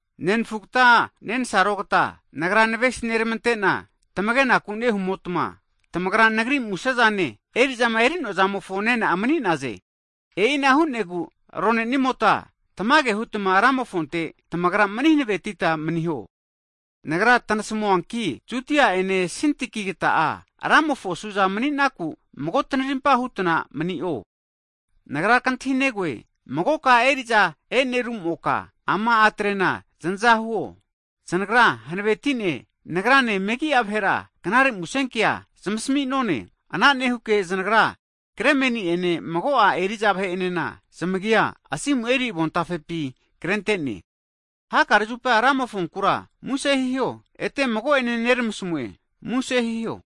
Nenfugta nensarogta, nagra navesi neramante'na tamage'naku nehumotma, tamagra nagri musezane, eri'zama eri'noazamofo nena'a mani'naze. E'ina hu'negu arone'nimota tamage hutma Ramofonte tamagra mani hanavetita maniho. Nagra tanasmuanki, Yodia ene Sintikigata'a Ramofo suza mani'naku mago tanarimpa hutna mani'o. Nagra kantahinegoe, magoka eri'za e'nerumoka, ama a'trena zanaza huo, znagra hanavetine nagrane megi'a vahera knare musenkea zamasmi'none. Ana nehuke znagra Klemeni ene mago'a eri'za vahe'enena, zamagia asimu eri avontafepi krente'ne. Hakare zupa Ramofonkura muse hiho, ete mago ene neramasmue, muse hiho!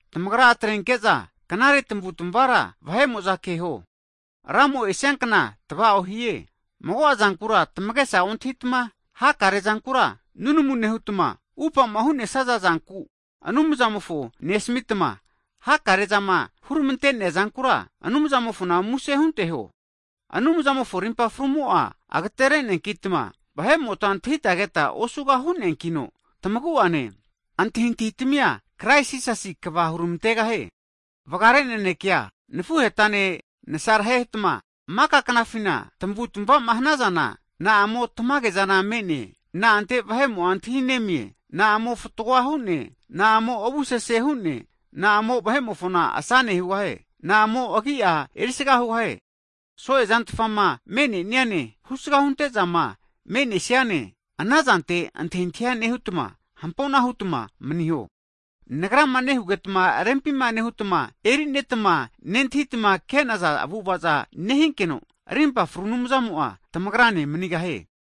Tamagra atrenke'za knare tamavu'tmavara vahe'mo'za keho, Ramo esia kna tva'o nehie. Mago'a zankura tamagesa ontahitma, hakare zankura nunamu nehutma, upama hu'nesaza zanku Anumzamofo nesamitma, hakare zama huramante'nea zankura, Anumzamofona muse hunteho. Anumzamofo rimpa frumo'a, agtere'neankitma vahe'mota antahita keta osuga hu'nonankino, tamagu'ane, antahintahi tamia Krais Jisasi kva huramantegahie. Vgare nanekea nafuhetane nasarhetma maka knafina tamavutamavama hanazana, na'amo tamage zana me'ne, na'ante vahe'mo'a antahi nemie, na'amo fatgoa hu'ne, na'amo avu sese hu'ne, na'amo vahe'mofona asane hugahie. Na'amo agi'a erisaga hugahie. So'e zantfama me'neniane, husga hunte'zama me'nesiana, anazante antahintahi nehutma hampona hutma maniho. Nagrama nehugetma rempi nehutma e'neritma, nentahitma ke'naza avu'avaza nehinkeno, rimpa fru Anumzamo'a tamagrane manigahie.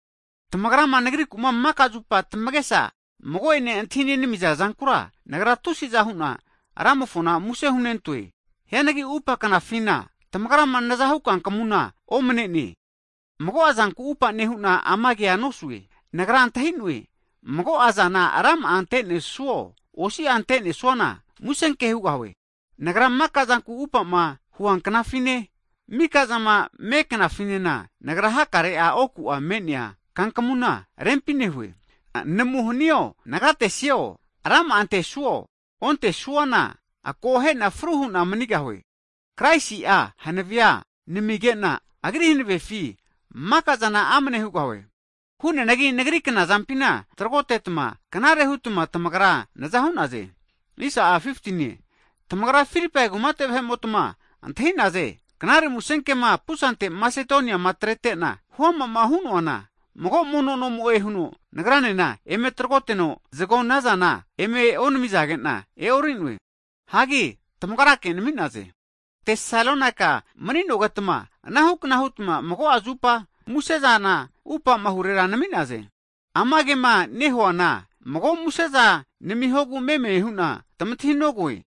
Tamagrama nagriku'ma maka zupa tamagesa mago'ene antahi nenamiza zankura, nagra tusiza hu'na Ramofona muse hunentoe. Hianagi upa knafina tamagrama nazahu kankamuna omane'ne. Mago'a zanku upa nehu'na ama kea nosue, nagra antahi'noe, mago'a zana rama'a antesuo, osi'a ante'nesuana, musenke hugahue. Nagra maka zanku upa'ma huanknafine, mika'zama meknafinena, nagra hakare oku'a me'nea kankmuna rempi nehue. Namu hanio, nagatesio, rama'a antesuo ontesuana akohena fru hu'na manigahue. Kraisi'a hanavea nenamigena, Agri hanavefi maka'zana amne hugahue. Hu'neanagi nagri knazampina tragotetma, knare hutma tamagra naza hu'naze. Tamagra Filipai kumate vahe'motma antahi'naze, knare musenkema pusante Masedonia atrete'na huama'ma hu'noana, mago mono nomo'e huno nagranena eme tragoteno, zagonazana eme onamizagena e'orinoe. Hagi tamagrake nami'naze. Tesalonaika mani'nogetma anahukna hutma mago'a zupa muse'zana atupamahure nami'naze. Ama kema nehuana mago museza namihogu meme huna tamantahinogoe,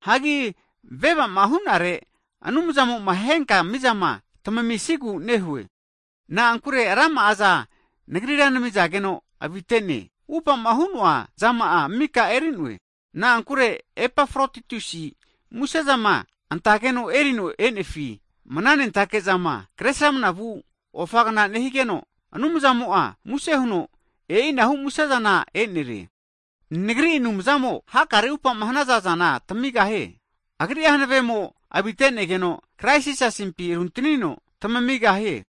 hagi veva'ma hu'nare, Anumzamoma henka mizama tamamisigu nehue. Na'ankure rama'aza nagrira namizageno avite'ne, upa'ma hu'noa zama'a mika eri'noe. Na'ankure Epafrotitusi musezama antageno erino e'nefina mananentake zama, kre sramna vu ofagna nehigeno, Anumzamo'a muse huno e'inahu musezana e'nerie. Nagri Anumzamo, hakare upa'ma hanaza zana tamigahie. Agri'a hanave'amo avite'negeno Krais Jisasimpi runtanino tamigahie.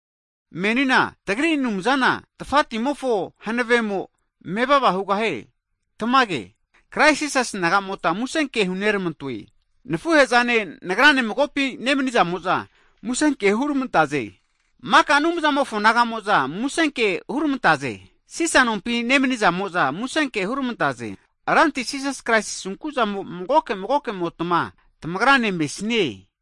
Menina tagri Anumzana tafati'mofo hanavemo mevava hugahie. Tamage. Krais Jisasi naga'mota musenke huneramantoe. Nafuhe'zane, nagrane magopi nemnizamo'za musenke hurmantaze. Maka Anumzamofo naga'mo'za musenke hurmantaze. Sisa nompi nemnizamo'za musenke hurmantaze. Ranti Jisas Kraisi asunku'zamo magoke magokemotma tamagra ne mesnie.